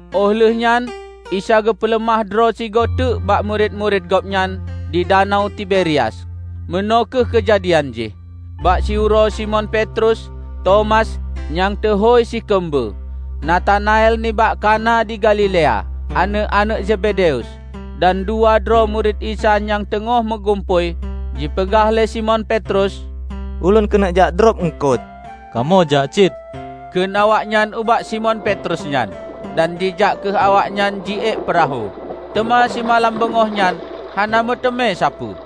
Óh lheuehnyan Isa geupeuleumah droe sigoe teuk bak murit-murit Gobnyan di Danau Tiberias. Meunoe kheueh keujadian jih: Bak siuroe Simon Petrus, Tomas, nyang teuhôi si Keumbeue, Natanael nibak Kana di Galilea, aneuëk-aneuëk Zebedeus, dan dua droe murit Isa nyang teungoh meugumpôi. Jipeugah lé Simon Petrus, "Ulôn keuneuk jak drob eungkot." "Kamoe jak cit," kheun awaknyan ubak Simon Petrus nyan. Dan jijak kheueh awaknyan jiék peurahô. Teuma simalam beungoh nyan hana meuteumé sapeue.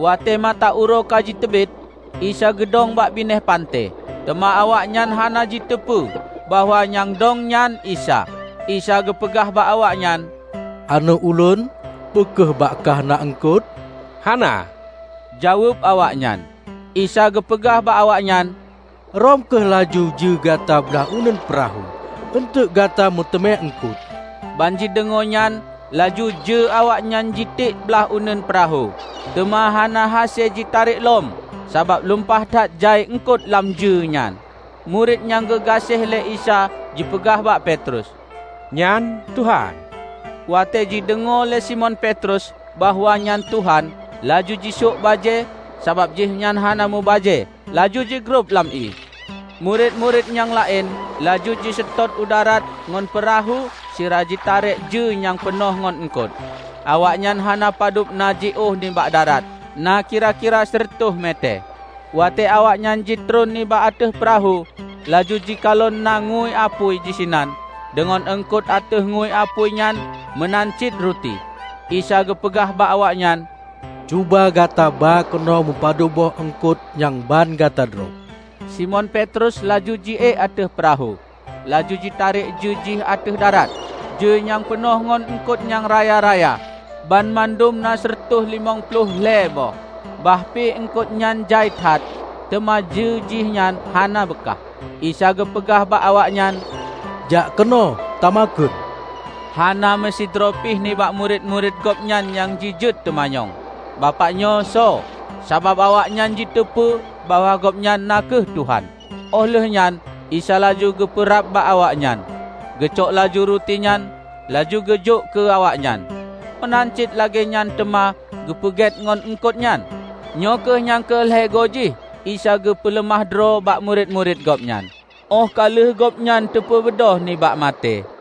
Watée mata uroe ka jiteubiet, Isa geudong bak binéh panté, teuma awaknyan hana jiteupeue bahwa nyang dong nyan Isa. Isa geupeugah bak awaknyan, "Aneuëk Ulôn, peu kheueh bak kah na eungkot?" "Hana," jaweueb awaknyan. Isa geupeugah bak awaknyan, "Rhom kheueh laju jeue gata blah uneuen peurahô, eunteuk gata meuteumé eungkot." Banjideungoe nyan laju jeue awaknyan jitiek blaih uneuen peurahô, teuma hana hase jitarek lom sabab lumpah that jai eungkot lam jeue nyan. Murit nyang geugaséh lé Isa jipeugah bak Petrus, "Nyan Tuhan!" Watée jideungoe lé Simon Petrus bahwa nyan Tuhan, laju jisok bajée (sabab jihnyan hana meubajée) laju jigrob lam ié. Murit-murit nyang laén laju jiseutôt u darat ngon peurahô, sira jitarek jeue nyang peunoh ngon eungkot. Awaknyan hana padub na jiôh nibak darat, na kira-kira sireutoh metée. Watée awaknyan jitron nibak ateueh peurahô, laju jikalon na ngeue apui disinan deungon eungkot ateueh ngeue apui nyan meunan cit ruti. Isa geupeugah bak awaknyan, "Cuba gata ba keunoe mupadub boh eungkot nyang ban gata drob." Simon Petrus laju jiék ateueh peurahô, laju jitarek jeue jih ateueh darat. Jeue nyan peunoh ngon eungkot nyang raya-raya; banmandum na sireutôh limong ploh lhée boh. Bah pi eungkot nyan jai that, teuma jeue jihnyan hana beukah. Isa geupeugah bak awaknyan, "Jak keunoe tamakheun." Hana meusidroe pih nibak murit-murit Gobnyan nyang jijeuet teumanyong, "Bapak nyoe soe?" Sabab awaknyan jiteupeue bahwa Gobnyan na kheueh Tuhan. Óh lheuehnyan Isa laju geupeurab bak awaknyan, geucok laju ruti nyan, laju geujok keu awaknyan. Meunan cit lagée nyan teuma geupeugét ngon eungkot nyan. Nyoe kheueh nyang keu lhée goe jih Isa geupeuleumah droe bak murit-murit Gobnyan óh ka lheueh Gobnyan teupeubeudôh nibak maté.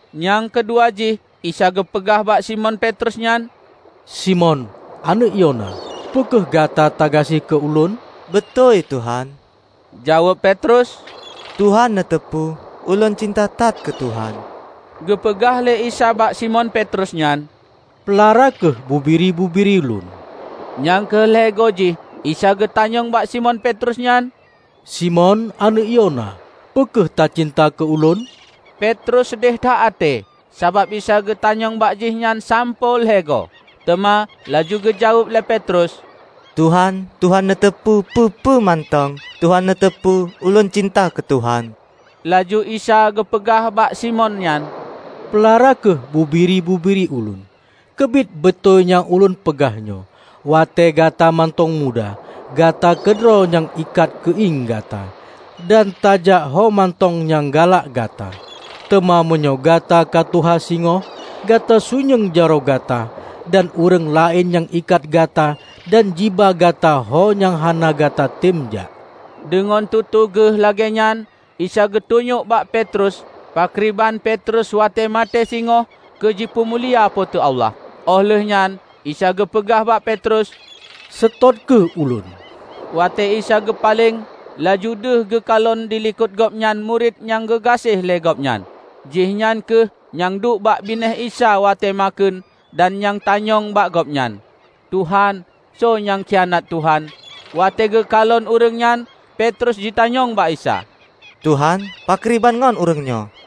Nyang keu dua jih Isa geupeugah bak Simon Petrus nyan, "Simon, aneuëk Yona, peu kheueh gata tagaséh keu Ulôn?" "Beutôi, Tuhan," jaweueb Petrus, "Tuhan neuteupeue ulôn cinta that keu Tuhan." Geupeugah lé Isa bak Simon Petrus nyan, "Peulara kheueh bubiri-bubiri Lôn." Nyang keu lhée goe jih Isa geutanyong bak Simon Petrus nyan, "Simon aneuëk Yona, peu kheueh tacinta keu Ulôn?" Petrus seudeh that até sabab Isa geutanyong bak jihnyan sampoe lhée goe. Teuma laju geujaweueb lé Petrus, "Tuhan, Tuhan neuteupeue peue-peue mantong, Tuhan neuteupeue ulôn cinta keu Tuhan!" Laju Isa geupeugah bak Simon nyan, "Peulara kheueh bubiri-bubiri Ulôn. Keubiet beutôi nyang Ulôn peugah nyoe: Watée gata mantong muda, gata keudroe nyang ikat keuieng gata, dan tajak homantong nyang galak gata. Teuma meunyoe gata ka tuha singoh, gata sunyueng jaroe gata, dan ureuëng laén nyang ikat gata dan jiba gata ho nyang hana gatatem jak." (Deungon tutoe Geuh lagée nyan Isa geutunyok bak Petrus pakriban Petrus watée maté singoh keu jipeumulia Po teu Allah.) Óh lheuehnyan Isa geupeugah bak Petrus, "Seutôt kheueh Ulôn!" Watée Isa geupaleng, laju deuh geukalon dilikot Gobnyan murit nyang geugaséh lé Gobnyan. (Jihnyan kheueh nyang duek bak binéh Isa watée makheun dan nyang tanyong bak Gobnyan, "Tuhan, soe nyang khianat Tuhan?") Watée geukalon ureuëng nyan, Petrus jitanyong bak Isa, "Tuhan, pakriban ngon ureuëng nyoe?"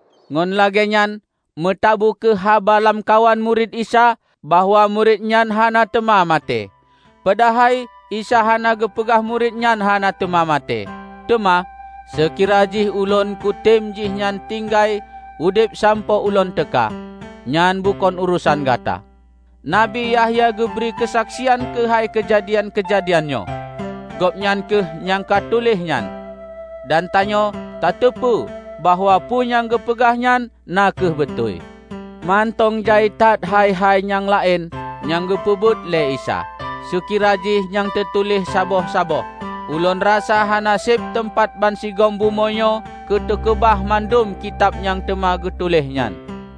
Ngon lagée nyan meutabu kheueh haba lamkawan murit Isa bahwa murit nyan hana teuma maté. Padahai Isa hana geupeugah murit nyan hana teuma maté, teuma: "Seukira jih Ulôn kutem jihnyan tinggai udeb sampoe Ulôn teuka, nyan bukon urosan gata." Nabi Yahya geubri keusaksian keuhai keujadian-keujadian nyoe. Gobnyan kheueh nyang ka tuléh nyan. Dan tanyoe tateupeue bahwa peue nyang geupeugah nyan na kheueh beutôi. Mantong jai that hai-hai nyang laén nyang geupeubuet lé Isa. Seukira jih nyan teutuléh saboh-saboh, Ulôn rasa hana seb teumpat bansigom bumoe nyoe keu teukeubah mandum kitab nyang teuma geutuléh nyan.